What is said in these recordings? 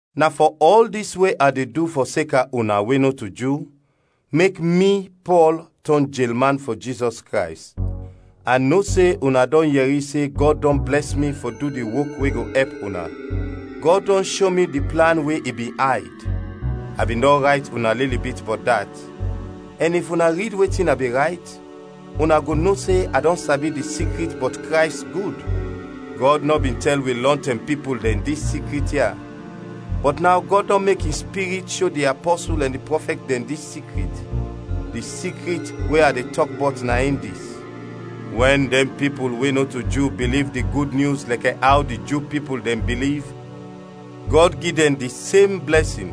Na fɔ ɔl dis we a de du fɔseka una we nɔto Ju, mek mi, Pɔl, tɔn jelman fɔ Jizɔs Krays. A no se una dɔn yɛri se Gɔd dɔn blɛs mi fɔ du di wok we go ɛp una. Gɔd dɔn sho mi di plan we i bin ayd. A bin dɔn rayt una lili bit bɔt dat. Ɛn if una rid wetin a bin rayt, una go no se a dɔn sabi di sikrit bɔt Krays, gud. Gɔd nɔ bin tɛl wi lɔntɛm pipul dɛn dis sikrit ya, bɔt naw Gɔd dɔn mek in Spirit sho di apɔsul ɛn di prɔfɛt dɛn dis sikrit. Di sikrit we a de tɔk bɔt na in dis: Wɛn dɛn pipul we nɔto Ju biliv di Gud Nyus lɛkɛ aw di Ju pipul dɛn biliv, Gɔd gi dɛn di sem blɛsin.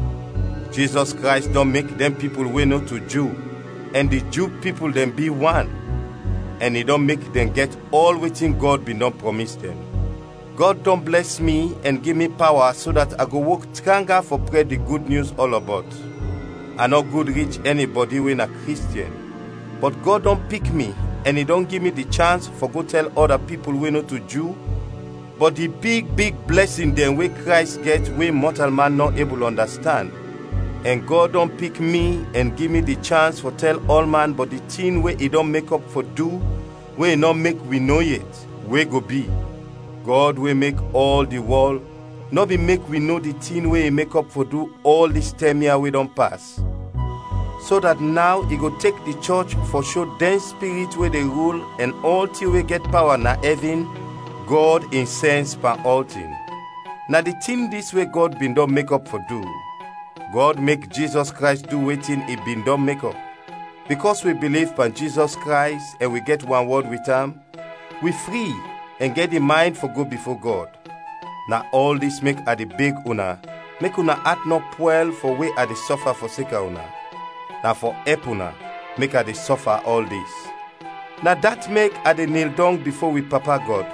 Jizɔs Krays dɔn mek dɛn pipul we nɔto Ju ɛn di Ju pipul dɛn bi wan, ɛn i dɔn mek dɛn gɛt ɔl wetin Gɔd bin dɔn prɔmis dɛn. Gɔd dɔn blɛs mi ɛn gi mi pawa so dat a go wok tranga fɔ prɛd di Gud Nyus ɔlɔbɔt. A nɔ gud rich ɛnibɔdi we na Kristiɛn, bɔt Gɔd dɔn pik mi ɛn i dɔn gi mi di chans fɔ go tɛl ɔda pipul we nɔto Ju bɔt di big big blɛsin dɛn we Krays gɛt we mɔtalman nɔ ebul ɔndastand. Ɛn Gɔd dɔn pik mi ɛn gi mi di chans fɔ tɛl ɔlman bɔt di tin we i dɔn mekɔp fɔ du we i nɔ mek wi no yet, we go bi. Gɔd we mek ɔl di wɔl nɔ bin mek wi no di tin we i mekɔp fɔ du ɔl dis tɛm ya we dɔn pas, so dat naw i go tek di chɔch fɔ sho dɛn spirit we de rul ɛn ɔltin we gɛt pawa na ɛvin Gɔd in sɛns pan ɔltin. Na di tin dis we Gɔd bin dɔn mekɔp fɔ du, Gɔd mek Jizɔs Krays du wetin i bin dɔn mekɔp. Bikɔs wi biliv pan Jizɔs Krays ɛn wi gɛt wanwɔd wit am, wi fri ɛn gɛt di maynd fɔ go bifo Gɔd. Na ɔl dis mek a de beg una mek una at nɔ pwɛl fɔ we a de sɔfa fɔseka una. Na fɔ ɛp una mek a de sɔfa ɔl dis. Na dat mek a de nil dɔng bifo wi Papa Gɔd.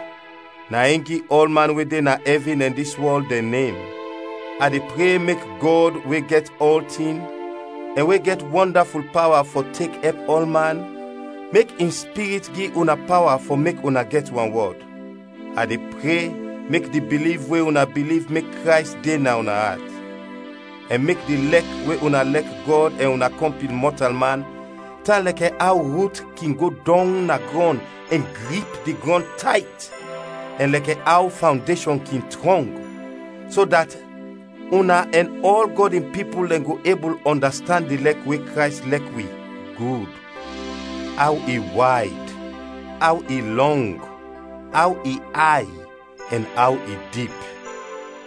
Na in gi ɔlman we de na ɛvin ɛn dis wɔl dɛn nem. A de pre mek Gɔd we gɛt ɔltin ɛn we gɛt wɔndaful pawa fɔ tek ɛp ɔlman, mek in Spirit gi una pawa fɔ mek una gɛt wanwɔd. A de pre mek di biliv we una biliv mek Krays de na una at; ɛn mek di lɛk we una lɛk Gɔd ɛn una kɔmpin mɔtalman tan lɛkɛ aw rut kin go dɔng na grɔn ɛn grip di grɔn tayt, ɛn lɛkɛ aw fawndeshɔn kin trɔng, so dat una ɛn ɔl Gɔd in pipul dɛn go ebul ɔndastand di lɛk we Krays lɛk wi, gud: aw i wayd, aw i lɔng, aw i ay, ɛn aw i dip.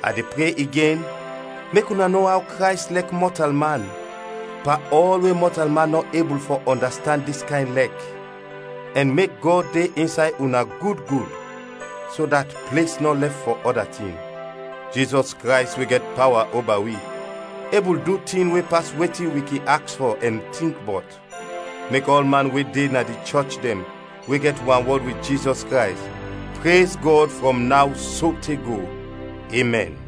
A de pre igen mek una no aw Krays lɛk mɔtalman, pan ɔl we mɔtalman nɔ ebul fɔ ɔndastand dis kayn lɛk, ɛn mek Gɔd de insay una gud gud, so dat ples nɔ lɛf fɔ ɔda tin. Jizɔs Krays we gɛt pawa oba wi, ebul du tin we pas wetin wi kin aks fɔ ɛn tink bɔt. Mek ɔlman we de na di chɔch dɛn we gɛt wanwɔd wit Jizɔs Krays, prez Gɔd frɔm naw sote go! Emɛn.